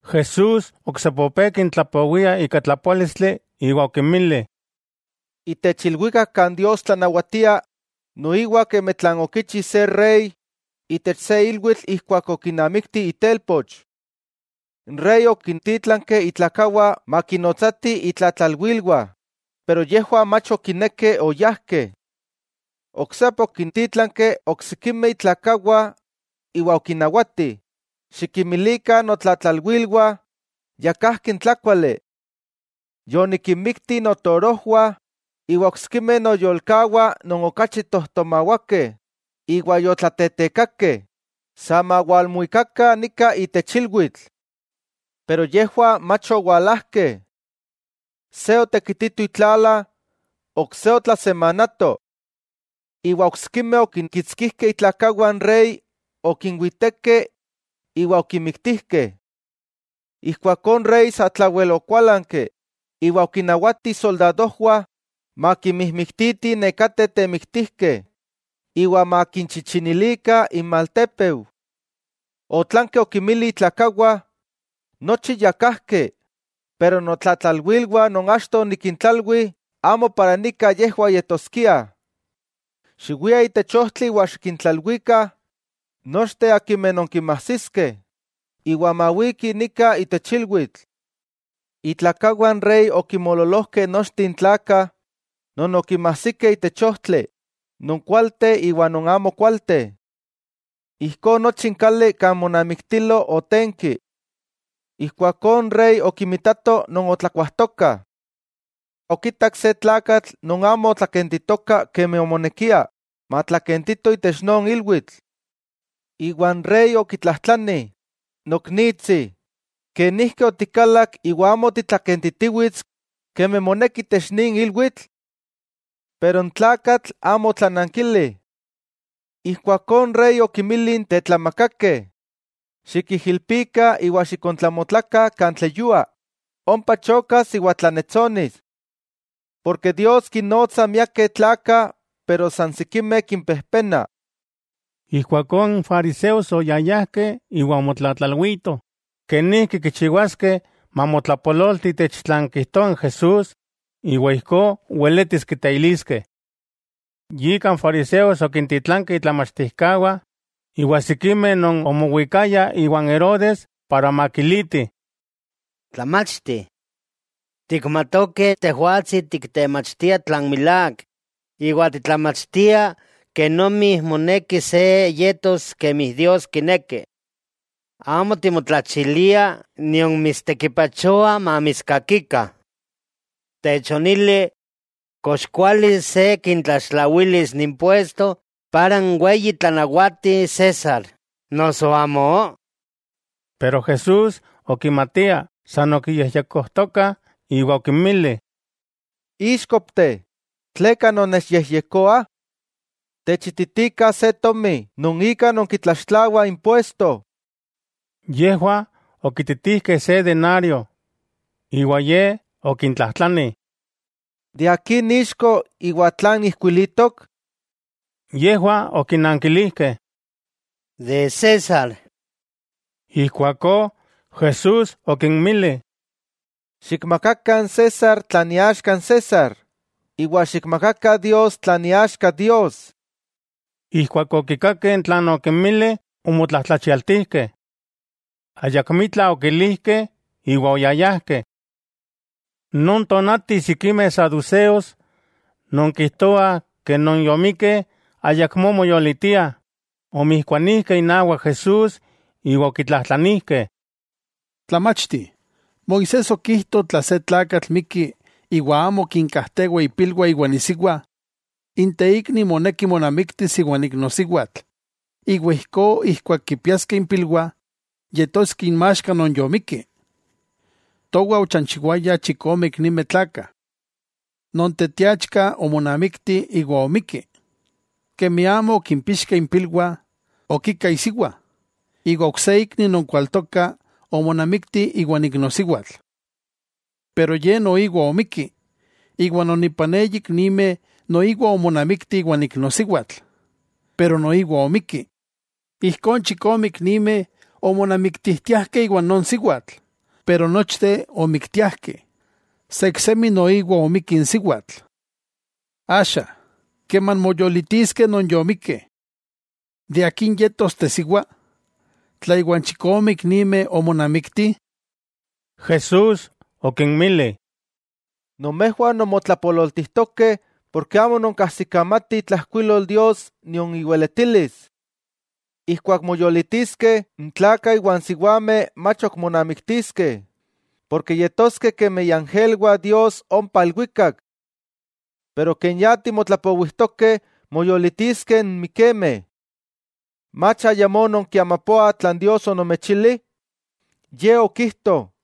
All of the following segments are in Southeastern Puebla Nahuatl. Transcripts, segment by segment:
Jesús oksepa opé kintlapowia ika tlapoálistli iwa okinmili: —Itech ilwikak kan Dios tlanawatia, noiwa kemi tlan okichi se rey itech se ilwitl ijkuak okinamikti itelpoch. N rey okintítlanki itlakawah makinnotsatih itlatlalwilwah, pero yejwah mach okinekeh oyajkeh. Oksepa okintítlanki oksikimeh itlakawah iwa okinnawati: “Xikinmilikah notlatlalwilwah ya kajki n tlákuali. Yonikinmikti notorojwah iwa oksikimeh noyolkawah non okachi tojtomawakeh, iwa yotlatetekakeh, sa mawalmuikakah nika itech ilwitl.” Pero yejwah mach owalajkeh. Se otekitito itlala, ok se otlasemanato. Iwa oksikimeh okinkitskijkeh itlakawah n rey, okinwitekeh iwa okinmiktijkeh. Ijkuakó n rey sa tlawel okuálanki, iwa okinnawati isoldadojwah makinmijmiktitih nekateh temiktijkeh iwa makinchichinilikah inmaltépeu. Otlanki okinmili itlakawah: “Nochi ya kajki, pero notlatlalwilwah non achto onikintlalwi amo yejwah walaskiah. Xiwiah itech ojtli iwa xikintlalwikah nochteh akimeh nonkinmajsiskeh, iwa mawikih nika itech ilwitl.” Itlakawah n rey okinmoololojkeh nochteh n tlakah non okinmajsikeh itech ojtli, non kualteh iwa non amo kualteh. Ijkó nochi n kali kan monamiktilo otenki. 'Ijkuakó n rey okinmitato non otlakuajtokah. Okitak se tlakatl non amo otlakentitoka kemi omonekia matlakentito itech non ilwitl. Iwa n rey okitlajtlani: “Noknitsi, ¿kenijki otikalak iwa amo titlakentitiwits kemi moneki itech nin ilwitl?” Pero n tlakatl amo otlanankili. Ijkuakó n rey okinmili n tetlamakakeh: “Xikijilpikah iwa xikontlamotlakah kan tleyua, ompa chokas iwa tlannetsonis.” Porke Dios kinnotsa miakeh tlakah, pero san sikimeh kimpejpenah. Ijkuakó n fariseos oyayajkeh iwa omotlatlalwitoh kenijki kichiwaskeh mamotlapololti itech tlan kijtoa n Jesús iwa ijkó weletis kiteiliskeh. Yika n fariseos okintitlankeh itlamachtijkawah iwa sikimeh non omowikayah iwan Herodes para makilitih: —Tlamachti, tikmatokeh Tejwatsi tiktemachtia tlan milák, iwa titlamachtia kenomi moneki se yetos kemi Dios kineki. Amo timotlachilia nion mitstekipachoa mamitskakikah. Techonili: ¿Kox kuali se kitlaxtlawilis impuesto para n weyi tlanawati César, noso amó? Pero Jesús okimatiah san okiyejyekojtokah iwa okinmili: —Íxkopteh, ¿tleka nonnechyejyekoah? Techititikah se tomi non ika nonkitlaxtlawah impuesto. Yejwah okititijkeh se denario. Iwa Ye okintlajtlani: —¿De akin ixko iwa tlan ijkuilitok? Yejwah okinankilijkeh: —De César. Ijkuakó Jesús okinmili: —Xikmakakah n César tlan iaxka n César, iwa xikmakakah Dios tlan iaxka Dios. Ijkuak okikakeh tlan okinmili, omotlajtlachialtijkeh. Ayakmitla okilijkeh iwa oyayajkeh. Non tonati sikimeh saduseos non kijtoah ke non yomikkeh ayakmó moyolitiah, omijkuanijkeh inawak Jesús iwa okitlajtlanijkeh: —Tlamachti, Moisés okijto tla se tlakatl mikki iwa amo kinkajtewa ipilwah iwan isiwa, n teikni moneki monamiktis iwan iknosiwatl iwa ijkó ijkuak kimpiaskeh impilwah, yetoskeh inmaxka non yomikki. Towah ochanchiwayah chikome iknimeh tlakah. Non teteachka omonamikti iwa omikki. Kemi amo okimpixkeh impilwah, okika isiwa, iwa ok se ikni non kualtoka omonamikti iwan iknosiwatl. Pero ye noiwa omikki, iwa non ipan eyi iknimeh noiwa omonamikti iwan iknosiwatl, pero noiwa omikki. Ijkó n chikomeh iknimeh omonamiktijtiajkeh iwan non siwatl, pero nochteh omiktiajkeh. Sa iksemi noiwa omikki n siwatl. Axa, keman moyolitiskeh non yomikkeh, ¿de akin yetos tesiwa, tla iwa n chikome iknimeh omonamikti? Jesús okinmili: —Nomejwah nonmotlapololtijtokeh porke amo nonkajsikamatih itlajkuilol Dios nion iweletilis. Ijkuak moyolitiskeh, n tlakah iwa n siwameh mach ok monamiktiskeh, porke yetoskeh kemi iangelwah Dios ompa ilwikak. Pero ken ya timotlapowijtokeh moyolitiskeh n mikemeh, ¿mach ayamó nonkiamapoah tlan Dios onomechili? Ye okijto: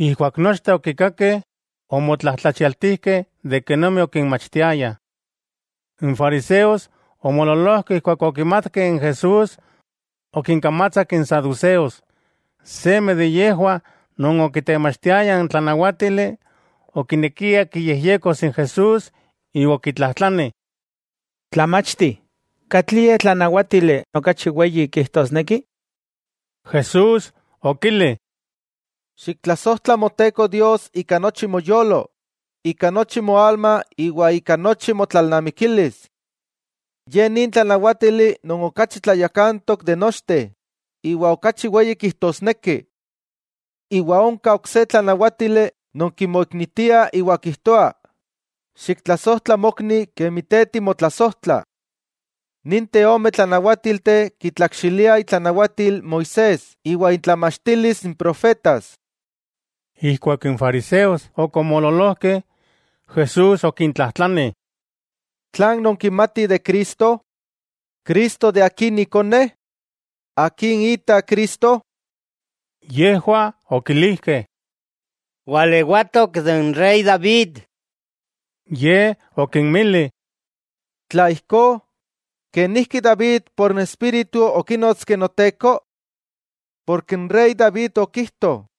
Ijkuak nochteh okikakeh, omotlajtlachialtijkeh de kenomi okinmachtiaya. N fariseos omoololojkeh ijkuak okimatkeh n Jesús okinkamatsak n saduceos. Seme de yejwah non okitemachtiaya n tlanawátili okinekia kiyejyekos n Jesús iwa okitlajtlani: —Tlamachti, ¿katlie tlanawátili okachi weyi kijtosneki? Jesús okili: —“Xiktlasojtla Moteko Dios ika nochi moyolo, ika nochi moalma iwa ika nochi motlalnamikilis.” Ye nin tlanawátili non okachi tlayakantok iwa okachi weyi kijtosneki. Iwa onka ok se tlanawátili non kimoiknitia iwa kijtoa: “Xiktlasojtla mokni kemi te timotlasojtla.” Ninteh ome tlanawátilteh kitlakxiliah itlanawatil Moisés iwa intlamachtilis n profetas. Ijkuak n fariseos ok omoololojkeh, Jesús okintlajtlani: —¿Tlan nonkimatih de Cristo? ¿Cristo akin ikone? ¿Akin ita Cristo? Yejwah okilijkeh: —Walewatok de n rey David. Ye okinmili: —Tla ijkó, ¿kenijki David por n Espíritu okínotski Noteko? Porke n rey David okijto: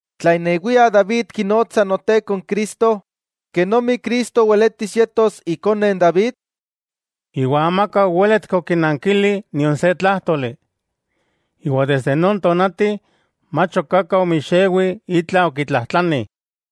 Tla inewia David kinotsa Noteko n Cristo, ¿kenomi Cristo weletis yetos ikone n David? Iwa amaka owéletki okinankili nion se tlájtoli, iwa desde non tonati, mach ok aka omixewi itla okitlajtlani.